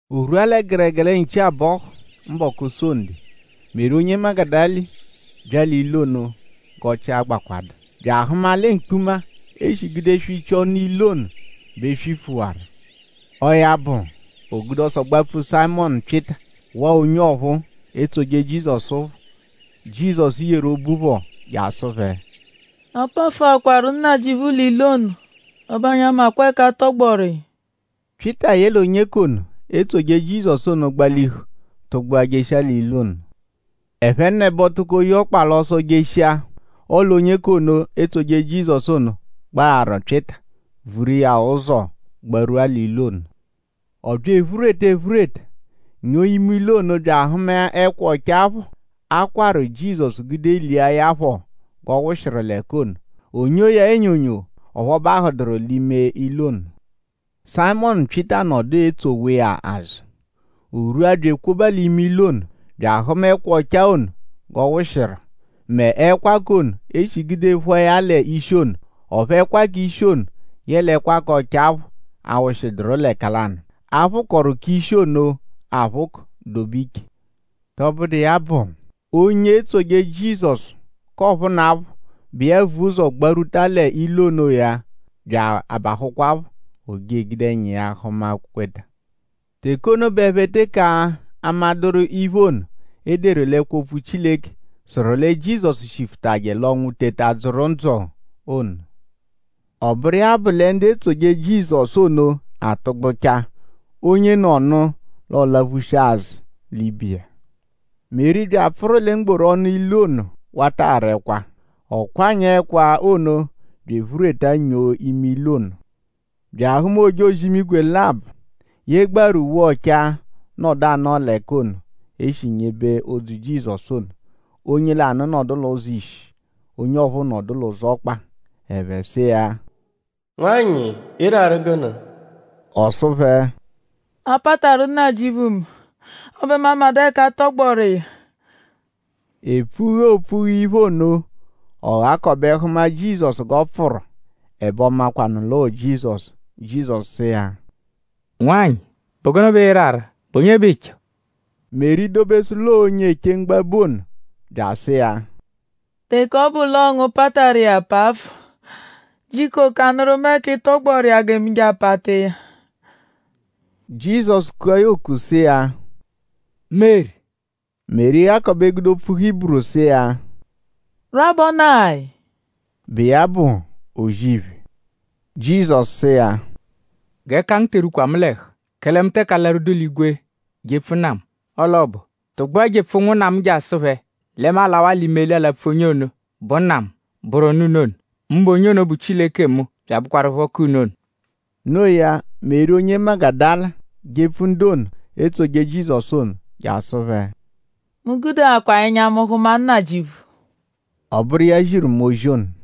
O rwua lẹ gẹregere nchi-abọhu mbọku Sonde; Meri onye Magudala bya l'ilu ono g'ọchii agbakwadu; bya ahụma lẹ mkpuma, e shi gude swichia ọnu ilu ono bẹ e swifuwaru. Ọo ya bụ; o gude ọso gbapfu Sayịmonu Pyịta; waa onye ọphuu, etsoje Jizọsu phọ, Jizọsu yeru obu phọ je asụ phẹ: “A pafụakwaru Nnajịuphu l'ilu ono. Ẹbe anyi amakwa ẹka a tọgboru iya.” Pyịta yẹle onye k'ono, etsoje Jizọsu ono gbalihu tụgbua jeshia l'ilu ono. Ẹphenebo tụko ye ọkpa l'ọso jeshia. Ọle onye k'ono, etsoje Jizọsu ono gbagharu Pyịta; vuru iya ụzo gbarwua ilu ono. Ọ bya ephureta ephureta; nyoo ime ilu ono bya ahụma ẹkwa ọchaa phọ, a kwarụ Jizọsu gude lia ya phọ g'ọ wụshiru l'ẹka ono. O nyoo ya enyonyo; ọphu ọ bahụduru l'ime ilu ono. Sayịmonu Pyịta nọdu etsowa iya l'azụ. O rwua bya ekwoba l'ime ilu ono bya ahụma ẹkwa ọchaa ono g'ọ wụshiru; mẹ ẹkwa k'ono, e shi gude phụa ya l'ishi ono. Ọphu ẹkwa k'ishi ono yẹle ẹkwa ọchaa phọ awụshiduru l'ẹka lanụ. A phụkoru k'ishi ono aphụko dobe iche. Tọbudu iya bụ l'onye etsoje Jizọsu k'ọphunapho, bụ iya vu ụzo gbarwuta l'ilu ono-a bya abahụkwapho. O je egude ẹnya iya hụma; kweta. Teke ono bẹ ẹphe teke amadụru iphe ono, e deru l'ẹkwo-opfu Chileke, sụru lẹ Jizọsu shifụtaje l'ọnwu teta dzụru ndzụ ono. Ọ bụru iya bụ lẹ ndu etsoje Jizọsu ono atụgbuchaa; onyenọnu l'ọ laphushia azụ l'ibe iya. Meri bya apfụru lẹ mgboru ọnu ilu ono wata ara ẹkwa. Ọ kwanyaa ẹkwa ono bya ephureta nyoo ime ilu ono; bya ahụma ojozi-imigwe labọ, yegbaaru uwe ọchaa nọdu anọo l'ẹka ono, e shi nyebe odzu Jizọsu ono. Onye lanụ nọdu l'ụzo ishi; onye ọphuu nọdu l'ụzo ọkpa. Ẹphe sụ iya: “Nwanyị;?ịiraru gụnu?” Ọ sụ phẹ: “A pataru Nnajịuphu mu; ẹbe mu amadụ ẹka a tọgboru iya.” Epfughe, oopfughe iphe ono; ọ ghakọbe hụma Jizọsu g'ọ pfụru. Ẹbe ọ makwanụ l'ọo Jizọsu. Jizọsu sụ iya: “Nwanyị;?bụ gụnu bẹ ịiraru??Bụ onye bẹ ịicho?” Meri dobesụ l'ọo onye eche mgbabu ono bya asụ iya: “Teke ọ bụ l'ọo ngu pataru iya pafụ; jiko kanụru mu ẹka ị tọgboru iya gẹ mu je apata iya.” Jizọsu kua ya oku sụ iya: “Meri!” Meri ghakọbe gude opfu Hiburu sụ iya: “Rabonayi!” bụ iya bụ O-zì-iphe. Jizọsu sụ iya: “G'ẹka ngu te erwukwa mu l'ẹhu; kẹle mu teke alarwudu l'igwe jepfu Nna mu. Ọle ọ bụ; tụgbua jepfu ụnwunna mu je asụ phẹ lẹ mu alawaa l'imeli alapfu onye ono, bụ Nna mu; bụru Nna unu ono; mbụ onye ono, bụ Chileke mu bya abụkwarupho k'unu ono.” No iya; Meri onye Magudala jepfu ndu ono, etsoje Jizọsu ono je asụ phẹ: “Mu gudeakwa ẹnya mu hụma Nnajịuphu!” Ọ bụru iya ziru mu ozi ono.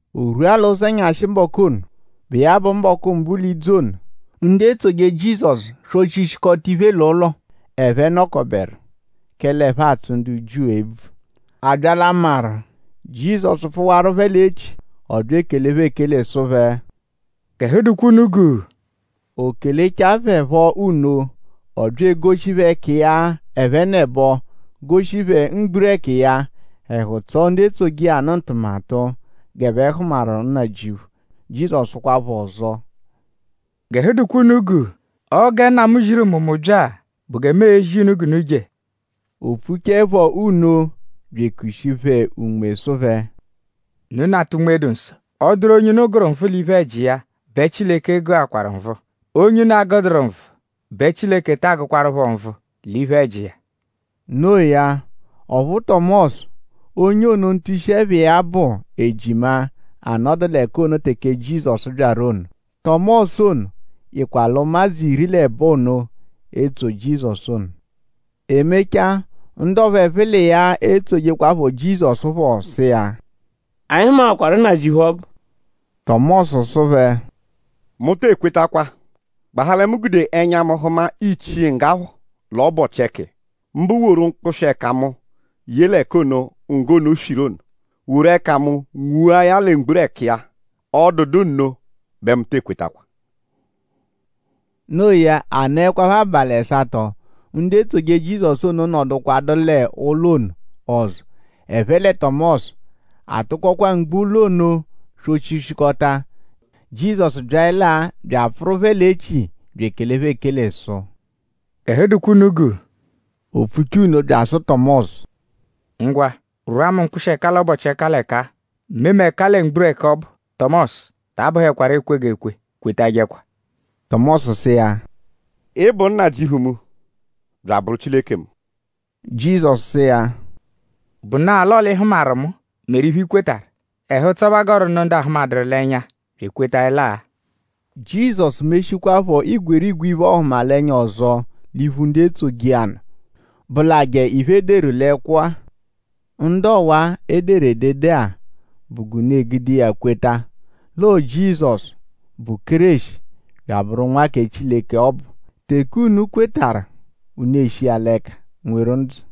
O rwua l'ụzenyashi mbọku ono, bụ iya bụ mbọku mbụ l'idzu ono; ndu etsoje Jizọsu swọ-chishikọta iphe l'ụlo, ẹphe dọkoberu; kẹle ẹphe atsụ ndu Jiu ebvu. A bya l'amarụ; Jizọsu pfụwaru phẹ l'echi. Ọ bya ekele phẹ ekele sụ phẹ: “G'ẹhu dụkwa unu guu.” O kelechaẹ phẹ phọ nno; ọ bya egoshi phẹ ẹka iya ẹphenebo goshi phẹ mgburẹku iya. Ẹhu tsọo ndu etsoje iya nụ ono ntụmatu g'ẹphe hụmaru Nnajịuphu. Jizọsu sụkwa phẹ ọzo: “G'ẹhu dụkwa unu guu. Ọo gẹ Nna mu ziru mu; mu bya-a bụ gẹ mu ezi unu g'unu je.” O pfuchaẹpho nno bya ekushi phẹ Unme sụ phẹ: “Unu nata Unme-dụ-Nsọ. Ọ -dụru onye unu gụru nvụ l'iphe-ẹji iya; bẹ Chileke gụakwaru nvụ. Onye unu agụduru nvụ bẹ Chileke taa gụkwarupho nvụ l'iphe-ẹji iya.” Noo ya; ọphu Tọmosu; onye ono ntushi-ẹpha iya bụ Ejima anọdu l'ẹka ono teke Jizọsu byaru ono. Tọmosu ono yịkwa l'ụmadzu iri l'ẹbo ono, etsoje Jizọsu ono. E mechaa; ndu ọphuu ẹphe l'iya etsojekwaphọ Jizọsu phọ sụ iya: “Anyi hụmakwaru Nnajịuphu ọbu!” Tọmosu sụ phẹ: “Mu tee kwetakwa; gbahaa lẹ mu gude ẹnya mu hụma ichii ngga phọ l'ọbochi-ẹka iya; mbụ woru mkpụshi-ẹka mu ye l'ẹka ono, ngga ono shiru ono; woru ẹka mu nwua ya lẹ mgburẹku iya. Ọ dụdu nno bẹ mu tee kwetakwa.” Noo ya; a nọekwapho abalị ẹsato; ndu etsoje Jizọsu ono nọdukwa l'ụlo ono ọzo; ẹphe lẹ Tọmosu. A tụkokwa mgbo ụlo ono swọ-chishikọta. Jizọsu byaẹlaa bya apfụru phẹ l'echi bya ekele phẹ ekele sụ: “G'ẹhu dụkwa unu guu.” O pfuchaa nno bya asụ Tọmosu: “Ngwa; rwụa mu mkpụshi-ẹka l'ọbochi-ẹka l'ẹka-a. Mee mu ẹka lẹ mgburẹku ọbu. Tọmosu; ta abụhekwaru ekwegekwe. Kwetajẹkwa.” Tọmosu sụ iya: “Ị bụ Nnajịuphu mu! Bya abụru Chileke mu!” Jizọsu sụ iya: “Bụna-a l'ọo l'ị hụmaru mu meru iphe, i kwetarụ. Ẹhu-ụtso bẹ a gọru nụ ndu ahụmaduru l'ẹnya bya ekwetaẹla-a.” Jizọsu meshikwaaphọ igwerigwe iphe-ọhumalenya ọzo l'iphu ndu etsoje iya nụ, bụlaje iphe, e deduru l'ẹkwo-a. Ndu ọwa-a, e deru edede-a bụ g'unu e-gude iya kweta l'ọo Jizọsu, bụ Kéreshi, bya abụru Nwa kẹ Chileke ọbu; teke unu kwetarụ unu eshi iya l'ẹka nweru ndzụ.